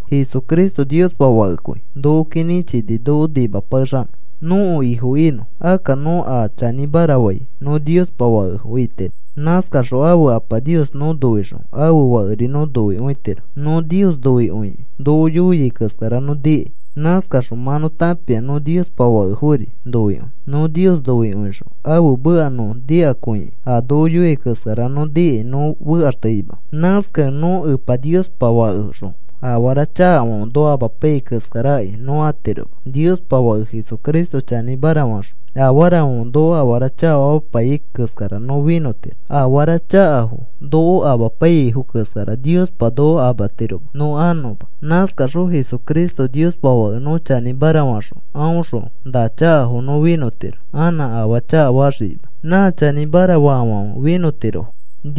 Jesucristo Niospa Fakekõi. Nokoki nĩchini noko nimapakexanõ, nõko Ifo inõ. Akka nõ a chanĩmara fai nõ Niospa fakefo itiro. Nãskaxõ ãfe Apa Nios nõ noixõ, ãfe Fakeri nõ noikõitiro. Nõ Nios noikõikĩ noko yoiai keskara nõ nikai. Nãskaxõ mã nõ tãpia nõ Niospa fakefori noikõi. Nõ Nios noikõixõ ãfe meka nõ nikakõikĩ a noko yoiai keskara nõ nikai nõ fekaxteima. Nãskakẽ nõ Epa Niospa fakexõ afara chakafãfe noko amapaiyai keskarakai nõ atiroma. Niospa Fake Jesucristo chanĩmara faxõ afarafãfe noko afara chakafamapaiyai keskara nõ finõtiro. Afara chakafo noko amapaiyaifo keskara Niospa noko amatiroma nõ anõma. Nãskaxõ Jesucristo Niospa Fake nõ chanĩmara faxõ aõxõ na chakafo nõ finõtiro anã afaa chakafaxikima. Nã chanĩmara faafãfe finõtirofo.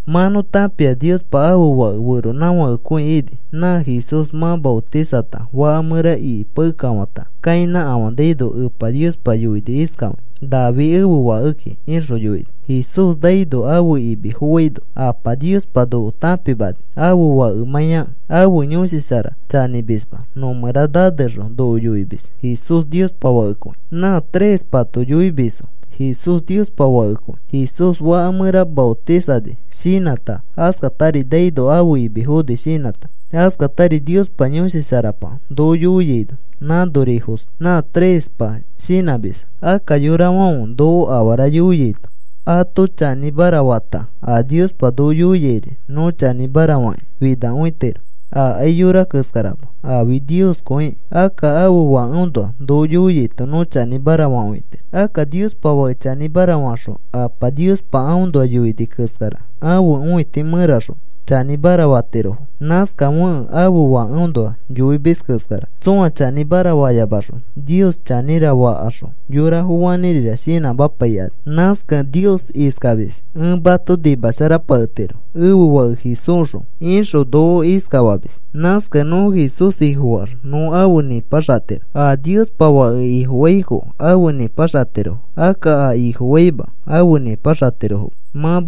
Mã nõ tãpia Niospa ãfe Fake feronãfakekõi ini. Nã Jesús mã maotisata faka mẽra ikipakekafãta kainãkafanaino, Epa Niospa yoini iskafakĩ: “Nafi ẽfe Fakeki,” ixõ yoini. Jesús naino ãfe imi foaino Apa Niospa noko tãpimani ãfe Fakemãiakẽ. Ãfe Yõshi Shara chanĩmisma nõmẽra nanexõ noko yoimis Jesús Niospa Fakekõi. Nã trespato yoimisfo Jesús Niospa Fakekõi. Jesús faka mẽra maotisani shinãta, askatari naino ãfe imi foni shinãta, askatari Niospa Yõshi Sharapa noko yoiaino, nãnorifos nã trespa shinãmisfo. Akka yorafãfe noko afara yoiaito ato chanĩmara fata a Niospa noko yoiairi nõ chanĩmara fakĩ finakõitiro. Akai yora keskarama, afi Nioskõikĩ. Akka ãfe Fakeõnoa noko yoiaito nõ chanĩmara fakõitiro. Akka Niospa Fake chanĩmara faxõ Apa Niospa aõnoa yoini keskara ãfe õiti mẽraxõ chanĩmara fatirofo. Nãskafekẽ ãfe Fakeõnoa yoimis keskara tsõa chanĩmara fayamaxõ, “Nios chanĩra,” fakaxõ yorafo fanĩrira shinãmapaikani. Nãskakẽ Nios iskamis: “Ẽ mato nimasharapaketiro ẽfe Fake Jesúsxõ,” ixõ noko iskafamis. Nãskakẽ nõ Jesús Ifofaax nõ afe nĩpaxatiro. A Niospa Fake Ifofaifo afe nĩpaxatirofo. Akka a Ifofaima afe nĩpaxatirofoma. Mã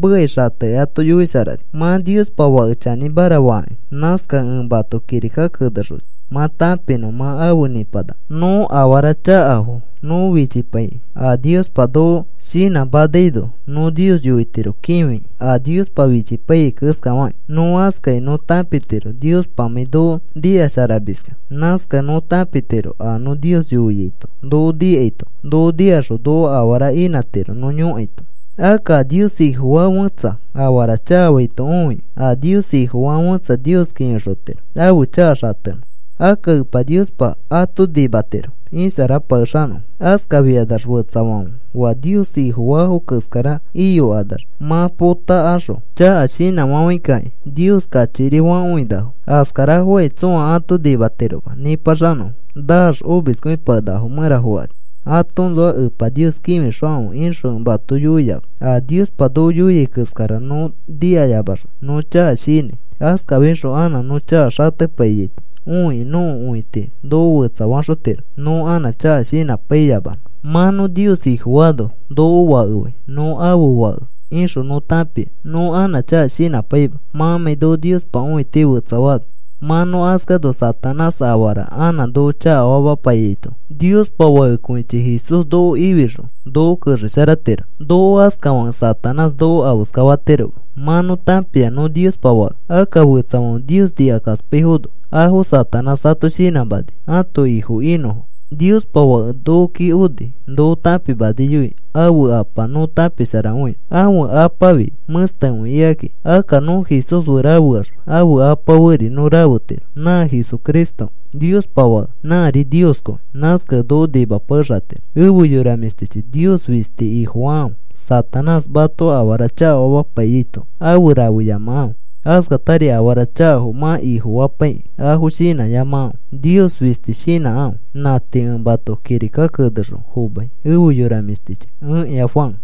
Niospa Fake chanĩmara faaki. Nãskakẽ ẽ mato kirika kenexoni, mã tãpinõ mã afe nĩpanaka. Nõ afara sharafo nõ fichipaikĩ, a Niospa noko shinãmanaino, nõ Nios yoitiro kĩfikĩ, a Niospa fichipaiyai keskafakĩ. Nõ askakĩ nõ tãpitiro Niospamãi noko nikasharamiskẽ. Nãskakẽ nõ tãpitiro a nõ Nios yoiaito noko nikaito noko nikaxõ noko afara inãtiro nõ yõkaito. Akka a Nios Ifofaa fẽtsa afara chakafaito õikĩ, a Nios Ifofaa fẽtsa Nios kĩfixotiro ãfe chaka xatenõ. Akka Epa Niospa ato nimatiro isharapakexanõfo. Askafikanax fetsafãfe oa Nios Ifofaafo keskara iyokanax mã potakaxõ chaka shinãfafãikakĩ Nios kachikiri fakõinafo. Askarafokai tsõa ato nimatiroma nĩpaxanõfo. Naax omiskõipakenakafo mẽra fokani. Atoõnoa Epa Nios kĩfixokãfe ixõ ẽ mato yoiama. A Niospa noko yoiai keskara nõ nikayamaxõ nõ chaka shinãi. Askafixõ anã nõ chaka xatepaiyaito õikĩ nõko õiti noko fetsafaxotiro, nõ anã chaka shinãpaiyamanõ. Mã nõ Nios Ifofaano, noko fakefai. Nõ ãfe fake ixõ nõ tãpia nõ anã chaka shinãpaima, mãmãi noko Niospa õiti fetsafaano. Mã nõ askano Satanás afara anã noko chakafamapaiyaito, Niospa Fakekõichi Jesús noko ifixõ noko kexesharatiro. Noko askafakẽ Satanás noko afeska fatiroma. Mã nõ tãpia nõ Niospa fake. Akka fetsafãfe Nios nikakaspaifono, afo Satanás ato shinãmani ãto ifo inõfo. Niospa Fake nokoki oni. Noko tãpimaniyoi ãfe Apa nõ tãpisharakõinõ. Ãfe Apafi mẽstekõi ikaki. Akka nõ Jesús fe rafeax ãfe Apa feri nõ rafetiro. Nã Jesucristo Niospa Fake. Nãri Nioskõi. Nãskakẽ noko nimapakexatiro. Efe yora mĩshtichi, Nios fisti Ifofakãfe. Satanás mato afara chakafamapaiyaito afe rafeyamakãfe. Askatari afara chakafo mã ifofapaikĩ afo shinãyamakãfe. Nios fisti shinãkãfe. Nã tii ẽ mato kirika kenexõ fomai, efe yora mĩshtichi. Ẽkĩa Juan